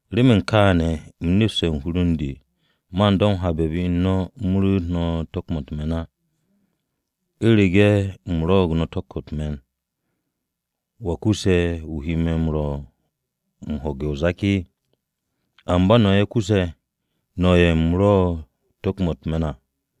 Remen kaane̱ u̱m e̱ste̱ u̱n hur u̱n de man do̱ m-habe̱ be u̱n no̱ u̱m ru̱'u̱t no̱ tu̱k-mo̱ u̱t-me̱n á. ¿U̱rege̱ u̱m rwo̱'o̱g no̱ tu̱k-mo̱ u̱t-me̱n, wa kusse̱ wu̱ he me̱ m-rwo̱ u̱m ho̱gu̱te̱ o-zak? Amba no̱ ye̱ kusse̱, no̱ ye̱ u̱m rwo̱'e̱ tu̱k-mo̱ u̱t-me̱n à.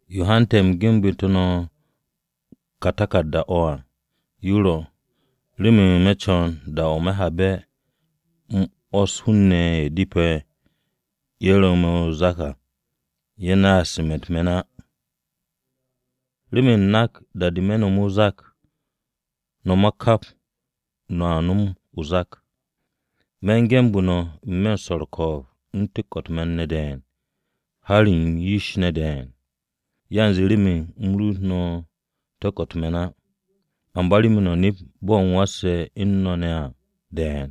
Yo hante̱ u̱m genbu̱te̱ no̱ o̱ ka taku̱rda-o̱ à, yo ro̱, remen me̱ co̱n da-o̱ me̱ habe̱ u̱m 'wo̱s hun-ne̱ ye̱ depe̱ ye̱ ru̱ me̱ o-zak à, ye̱ naas me̱ u̱t-me̱n á. Remen u̱m nak da-de me̱ nomu̱ o-zak, no̱ ma kap no̱a nom o-zak. Me̱ u̱n genbu̱ no̱, n-me̱ u̱n swo̱ u̱r-ko̱o̱b u̱n tu̱k-mo̱ u̱t-me̱n ne̱ de̱e̱n, har m-yish ne̱ de̱e̱n. Yanze remen u̱m ru̱'u̱t no̱ tu̱k-mo̱ u̱t-me̱n á, amba remen no̱ nept bo̱ u̱m wasse̱ u̱n no̱ ne̱ à de̱e̱n.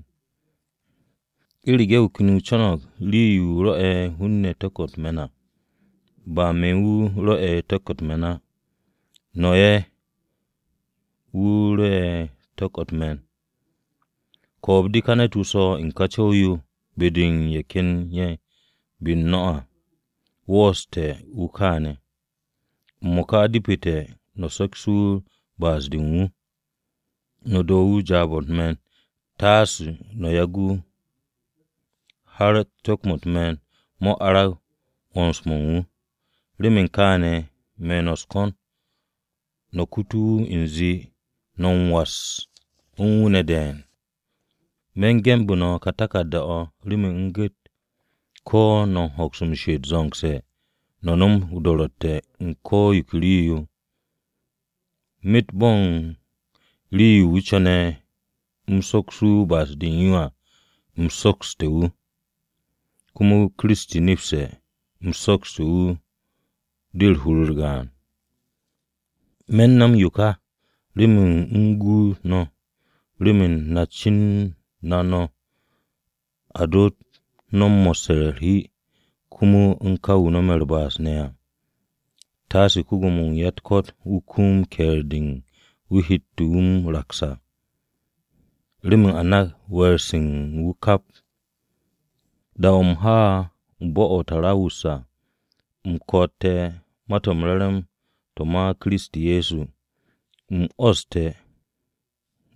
U̱rege̱ wu̱ ken wu̱ no̱mo̱g rii-yo rwo̱'e̱ hun-ne̱ tu̱k-mo̱ u̱t-me̱n à, ba me̱ wu̱ rwo̱'e̱ tu̱k-mo̱ u̱t-me̱n á. No̱ ye̱ wu̱ rwo̱'e̱ tu̱k-mo̱ u̱t-me̱n. Ko̱o̱b-de ka ne̱t-wu̱ swo̱ u̱n ka co̱w-yo be-de u̱n ye̱ ken ye̱ be-u̱r no̱ à, wooste̱ wu̱ kaane̱. M-mo̱ka, depete̱ no̱ sokse̱ wu̱ ba'as-de u̱n wu̱, no̱ do̱ wu̱ jaab-o̱ u̱t-me̱n taase no̱ yagu̱ wu̱, har tu̱k-mo̱ u̱t-me̱n mo̱ arag 'wo̱ns-mo̱ u̱n wu̱. Remen kááne̱ me̱ no̱ u̱s-ko̱n no̱ kutu wu̱ u̱nze no̱ m-was u̱n wu̱ ne̱ de̱e̱n. Me̱n genbu̱ no̱ ká taku̱rda-o̱ remen u̱m gu̱t, ko̱ no̱a hoks m-she'et zo̱ngse̱ no̱ nom do̱ro̱tte̱-o̱ u̱n ko̱ yo ke rii-yo à. Myet bo̱n rii-yo wu̱ co̱ne̱ u̱m soksu̱ wu̱ ba'as-de u̱n yo à, u̱m soksu̱te̱ wu̱, komo Kiristi nepste̱ u̱m soksu̱te̱ wu̱ de hur-u̱r gaan. Me̱ u̱n no̱m yo ka remen u̱m guut no̱ remen na cen na no̱ a doot no̱ mo̱sse̱ u̱r-hi komo u̱n ka wu̱ no̱me̱ u̱r-ba'as ne̱ à. Taase ko-Gwo̱mo-wu̱ u̱n ya-u̱t-ko̱t wu̱ kum ke̱e̱r-de wu̱ hette̱ na m-raks à, remen a nak we̱e̱r-se u̱n wu̱ kap. Da-o̱ u̱m ha bo̱-o̱ o-To̱ruwas à u̱m ko̱'o̱te̱ Ma-to̱ m-Re̱re̱m to̱ ma Kiristi Ye̱so, u̱m 'wo̱ste̱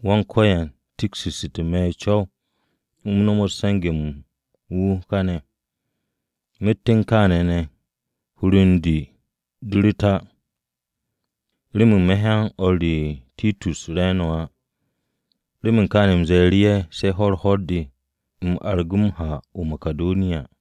Wan-Ko̱yan tiksu̱te̱ me̱ ish u̱m nomot se̱nge̱-mo̱ u̱n wu̱ káne̱. Myet u̱n kááne̱ ne̱ hur u̱n de de ru̱t á, remen me̱ hyan o̱r re Titus re̱e̱no̱ á. Remen kaane̱ u̱m ze̱e̱ru̱ ye̱ se̱ ho̱-u̱r ho̱r-de, u̱m argu̱ru̱ ha-mo̱ o-Makidoniya.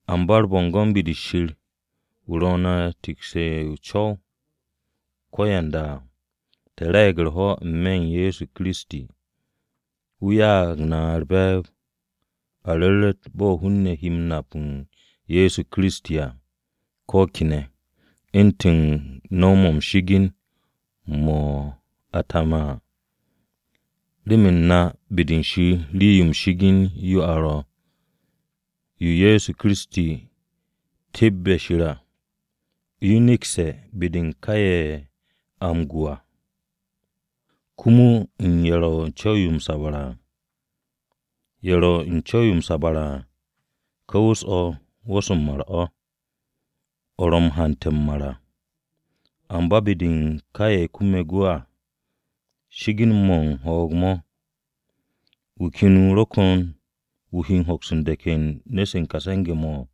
Amba u̱r-bo̱ngo̱n be-de Shir, wu̱ ro̱ na u̱n teke̱ o-co ko̱yanda à, te̱ re̱e̱g u̱r-ho̱ n-me̱ u̱n Ye̱so Kiristi. Wu̱ ya'ag na u̱r-be̱e̱b a ru̱ru̱t bo̱ hun-ne̱ he nap u̱n Ye̱so Kiristi à ko̱ kene̱, u̱ntu̱n no̱w-mo̱ m-shi'igin mo̱ a taame̱ à. Remen na be-de Shir rii-yo m-shi'igin yo a ro̱, yo Ye̱so Kiristi tebbe̱ Shir à, yo nekse̱ be-de u̱n ka ye̱ a u̱n gwu̱ à, komo u̱n ye̱ ro̱ ne̱ u̱n co̱w-yo m-sabre̱ à. Ye̱ ro̱ u̱n co̱w-yo m-sabre̱ à, ka wu̱s-o̱, wu̱s-o̱ m-mar o̱, o̱ ro̱ m-hante̱ m-mar à. Amba be-de u̱n ka ye̱ kume̱ gwu̱ à, shi'igin-mo̱ u̱n ho̱o̱g-mo̱. ¿Wu̱ ken wu̱ ro̱ ko̱n wu̱ he hoks m-de̱k u̱n nu̱-se u̱n ka se̱nge̱-mo̱?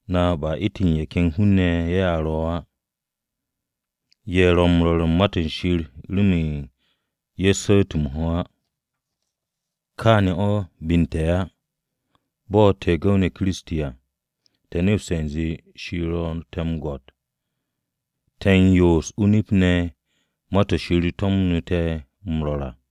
Na ba u̱ntu̱n ye̱ ken hun-ne̱ ye̱ a ro̱ á, ye̱ ro̱ m-rwo̱r u̱n Ma-to̱ Shir remen ye̱ su̱u̱t m-ho̱ á. Kaane̱ o̱ be u̱n te̱ á, bo̱ te̱ gu̱w-ne̱ Kiristi à, te̱ nepste̱ u̱nze Shir ro̱ te̱ o-gwo̱t, te̱ m-yoos o-nip ne̱ ma-to̱ Shir to̱mu̱te̱ m-rwo̱r à.